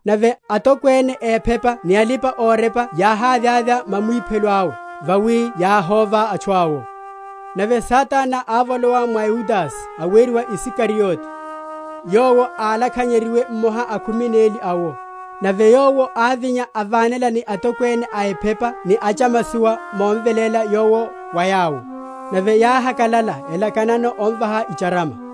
Nave atokwene a ephepa ni alipa‐orepa yáhavyavya mamwiphelo awe, vawi yáhóva atchu awo. Nave Satana ávolowa mwa Yudase aweriwa Isikariote, yowo álakhanyeryiwe mmoha a khumi neli awo. Nave yowo ávinya, avánela ni atokwene a ephepa ni achamasowa momveléla Yowo wa yawo. Nave yáhakalala, elakanano omvaha icharama.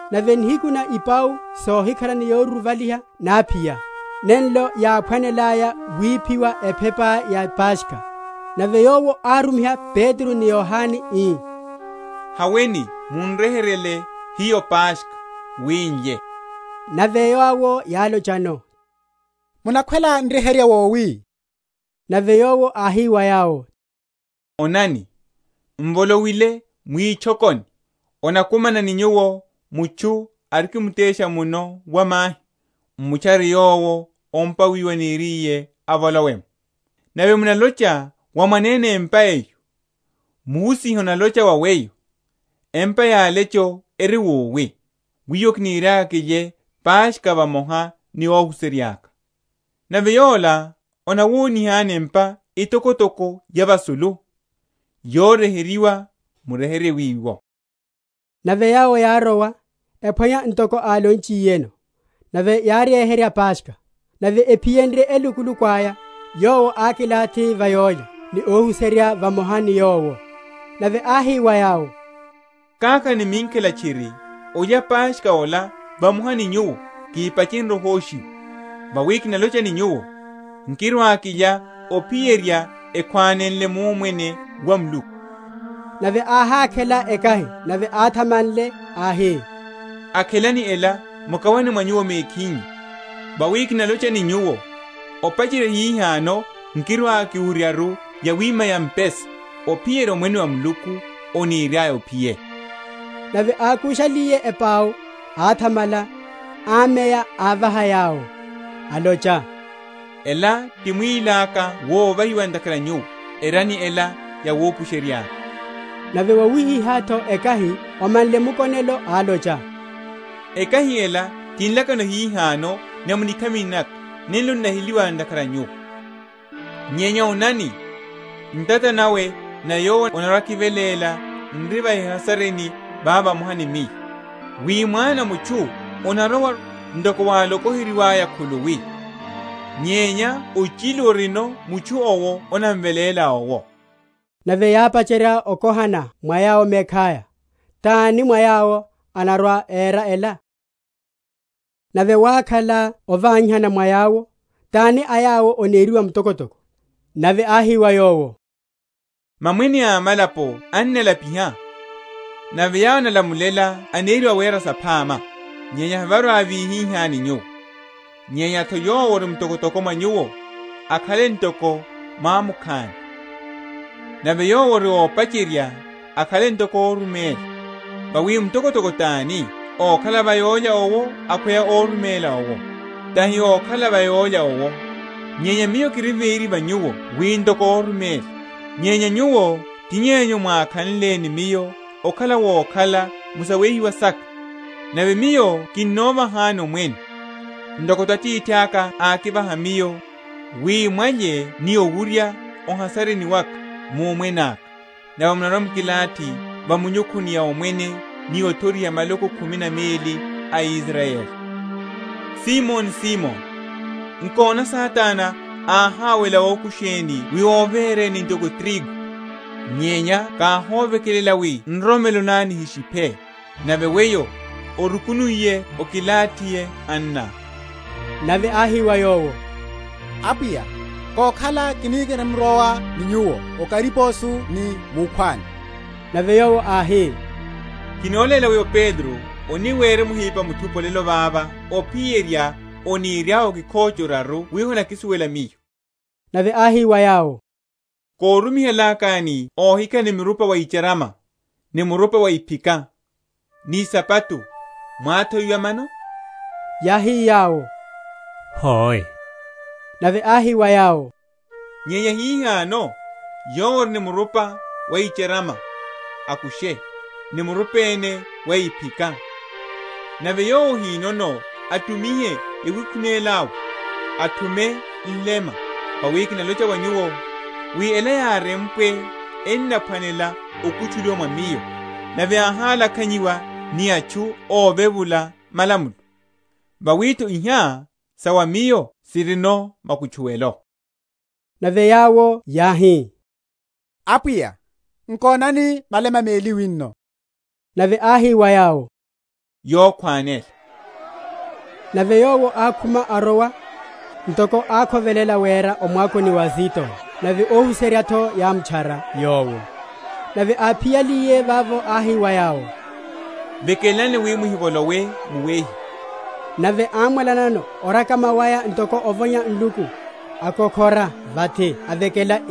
Nave nihiku na ipau sohikhala ni yoruruvaliha náphiya, nenlo yáphwanelaya wiphiwa ephepa ya Paskha. Nave Yowo árumiha Petro ni Yohane, ii, Haweni mun’ryeheryele hiyo Paskha, wi n’lye. Nave yawo yálochano, Munakhwela n’ryeherye wowi? Nave Yowo áhi wa yawo, Onani, m’volowile mwitchokoni, anakumana ni nyuwo mutchu arikimtesha muno wa mahi; m’mutchare yowo o’mpa wiwo aniriye avolowe’mo. Nave munalocha wa mwanene empa eyo, Muhusiha analocha ni weyo, Empa ya alecho eri wowi? wiwo kiniriaka kilye Paskha vamoha ni óhuserya’ka? Nave yola anawonihani empa etokotoko ya vasulu, yoryeheryiwa: muryeherye wiwo. Nave yawo yárowa, ephwanya ntoko álonchiyeno: nave yáryeherya Paskha. Nave ephiyenrye elukuluku aya, Yowo ákilathi va yólya, ni óhuserya vamoha ni Yowo. Nave áhi wa yawo, Kákhala ni minkhela tchiri olya Paskha ola vamoha ni nyuwo, kihipachenrye ohoshiwa; vawi kinalocha ni nyuwo, Nkirwa‐kilya ophiyerya ekhwanenle mu Omwene wa Muluku. Nave áhakhela ekahi, nave athamanle, áhi, Akhelani ela, mukawane mwa nyuwo mekhinyu: vawi kinalocha wa nyuwo, opacherya hihano Miyo nkirwa‐kiwuryaru yawima ya mpesa, ophiyerya Omwene wa Muluku oniriaya ophiye. Nave ákushaliye ipau, áthamala, ámeya, ávaha yawo, alocha, Ela ti mwíli aka wovahiwa ntakhara a nyuwo; erani ela yawupusherya’ka. Nave yawihihá’tho ekahi, omanle mukonelo, alocha, Ekahi ela ti nlakano nahihano mu nikhamini naka nenlo n’naheliwa ntakhara a nyuwo. Nyenya onani, ntata nawe na yowo anarwa‐akiveléla n’ri va ehasarini vava vamoha ni Miyo. Wi Mwana a mutchu anarowaru, ntoko wálokoheryiwa khuluwi; nyenya ochilu orino mutchu’wo anamveléla owo! Nave yápacherya okohana mwa yawo mekhaya, tani mwa yawo anarwa‐era ela. Mutokwene tani? Nave wákhala ovanyihana mwa yawo, tani a yawo aneriwa mtokotoko. Nave áhi wa yawo, Mamwene a amalapo ennalapiha; nave yawo enálamulela eneriwa Awera‐saphama. Nyenya hevarwa‐vihihá ni nyuwo: nyenya’tho yowo ori mtokotoko mwa nyuwo, akhale ntoko mwamukhani; nave yowo ori ópacherya, akhale ntoko óruméla. Vawi mtokotoko tani, ókhala va yólya owo akhweya órumela owo? tahi ókhala va yólya owo? nyenya Miyo kiri véri va nyuwo wi ntoko óruméla. Nyenya nyuwo ti yenyu mwákhanle ni Miyo okhala wokhala mu sawehiwa saka; nave Miyo kinnovahani omwene, ntoko’tho Atithaka ákivaha Miyo, wi mwalye ni owurya o’hasarini waka mu Omwene aka; nave munarwa‐mukilathi va minyukhuni ya omwene ni othoriha maloko khumi na meli a Israyeli. Olopoliwa wa Petro. Simoni, Simoni, nkona, Satana áháwela okusheni wi overeni ntoko tirigu: nyenya káhovekelela wi nroromelo ná nihishiphe: nave weyo, orukunuiye okilathihe anná. Nave áhi wa Yowo, Apwiya, kokhala, kiniri?-?mrowa ni Nyuwo o kariposo ni wukhwani. Nave Yowo áhi, Kinoléla weyo, Petro, oni wirimuhipa muthupi olelo vava ophiyerya oniryá okhóche oraru wi honakisuwela Miyo. Nave áhi wa yawo, Korumi?-?halakani óhikhala ni murupa wa icharama, ni murupa wa iphika, ni isapato, mwáthowiwa mano? Yáhi yawo, Hoe. Nave áhi wa yawo, Nyenya hihano, yowo ori ni murupa wa icharama, akushe, ni murupa ene wa iphika: nave yowo ahinono, atumihe yawikhunela yawe, athume nlema. Vawi kinalocha wa nyuwo, wi ela yárempwe enaphwanela okutchuliwa mwa Miyo, Nave áhalakhanyiwa ni atchu óvevula malamulo; vawi’tho iha sa wa Miyo sirino makutchuwelo. Nave yawo yáhi, Apwiya, nkonani, malema meli wino. Nave áhi wa yawo, Yokhwanela. Getsemane. Nave Yowo ákhuma, arowa, ntoko ákhovelela wera, o mwakoni wa Azitona; nave óhuserya’tho yámutchara Yowo. Nave áphiyaliye vavo, áhi wa yawo, Vekelani wi muhivolowe mu wehiwa, nave ámwalanano orekama waya ntoko ovonya nluku, akokhora vathi avekela,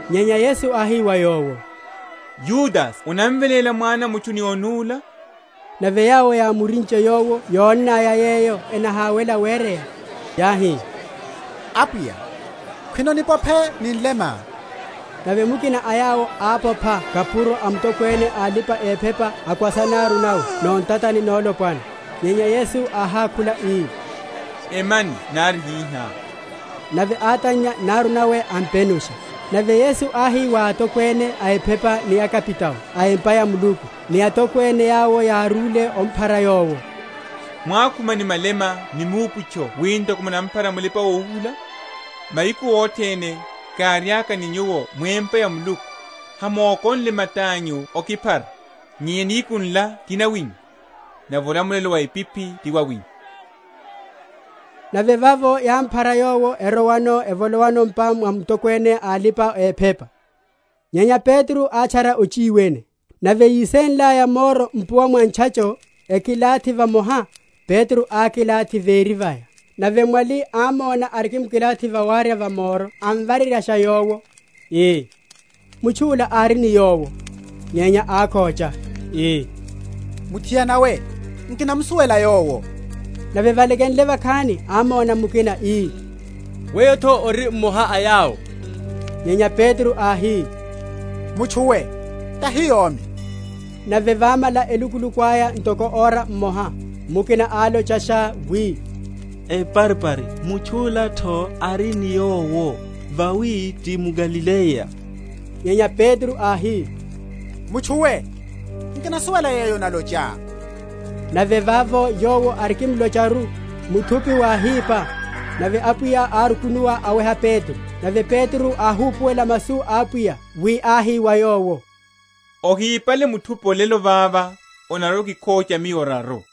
Nyenya Yesu áhi wa yowo, Yudase onamveléla Mwana a mutchu ni onúla? Nave yawo yámurinche Yowo yónnaya yeyo enahawela wereya, yáhi, Apwiya, khwino nipophe ni nlema? Nave mukina a yawo ápopha kapuro a mutokwene a alipa‐ephepa, akwasa naru nawe nontatani nolopwana. Nyenya Yesu áhákhula ii, Emyani nari hihá. Nave átannya naru nawe, ampenusha. Nave Yesu áhi wa atokwene a ephepa ni akapitao a empa ya Muluku, ni atokwene, yawo yárúle omphara Yowo, Mwákhuma ni malema ni miuputcho wi ntoko munamphara mulipa‐ohuhula? Mahiku othene, káriaka ni nyuwo mu empa ya Muluku, hamókonie mata’nyu okiphara: nyenya nihiku nla ti nawinyu, nave olamulelo wa epiphi ti wawinyu. Okhócha wa Petro. Nave vavo yámphara Yowo, erowano, evolowa m’pa mwa mutokwene a alipa‐ephepa. Nyenya Petro átchara ochiwene. Nave yísenlaya moro mpuwa mwa ntchacho, ekilathi vamoha, Petro ákilathi véri vaya. Nave mwali ámóna arikimkilathi va warya wa moro, amvareryasha yowo, ii, Mutchu’la ári ni Yowo. Nyenya ákhócha, ii, Muthiana we, nkinamusuwela Yowo. Nave valekenle vakhani, ámóna mukina, ii, Weyo’tho ori mmoha a yawo. Nyenya Petro áhi, Mutchu we, tahi yomi. Nave vámala elukuluku aya ntoko ora mmoha, mukina álochasha wi, Eparipari, mutchu’la’tho ári ni Yowo, vawi ti mGalileya. Nyenya Petro áhi, Mutchu we, nkinasuwela yeyo onalochá. Nave vavo, yowo arikimlocharu, muthupi wáhipa. Nave Apwiya árukunuwa, aweha Petro. Nave Petro áhupuwela masu a Apwiya, wi áhi wa yowo, Ohipale muthupi olelo vava, onarwa‐okikhócha Miyo oraru.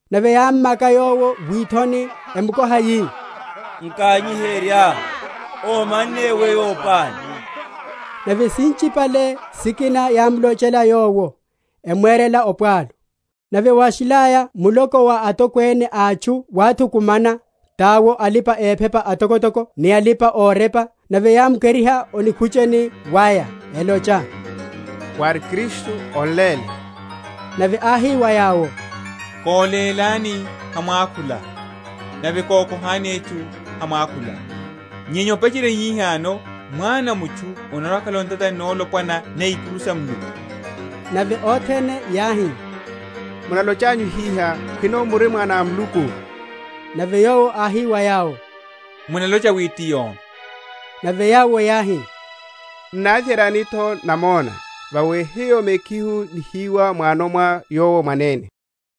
Nave yámmaka Yowo withoni, emukoha, yi, Nkanyiherya: omanne weyo pani? Nave sinchipale sikina yámlochela Yowo, emwerela opwalu. Nave wáshilaya muloko wa atokwene a atchu wáthukumana, tawo alipa‐ephepa atokotoko ni alipa‐orepa; nave yámukeriha o nikhucheni waya, elocha, Wári Kristu, on’léle. Nave áhi wa yawo, Kolélani, hamwakhula; nave kokohani etchu, hamwakhula. Nyenya opacherya hihano Mwana a mutchu anarwa‐akhala o ntatani nolopwana na ikuru sa Muluku. Nave othene yáhi, Munalochanyu hiha, khwino muri Mwana a Muluku? Nave Yowo áhi wa yawo, Munalocha wi ti yomi. Nave yawo yáhi, N’navyeryani’tho namona? vawi hiyo mekhihu nihiwa m’wano mwa Yowo mwanene.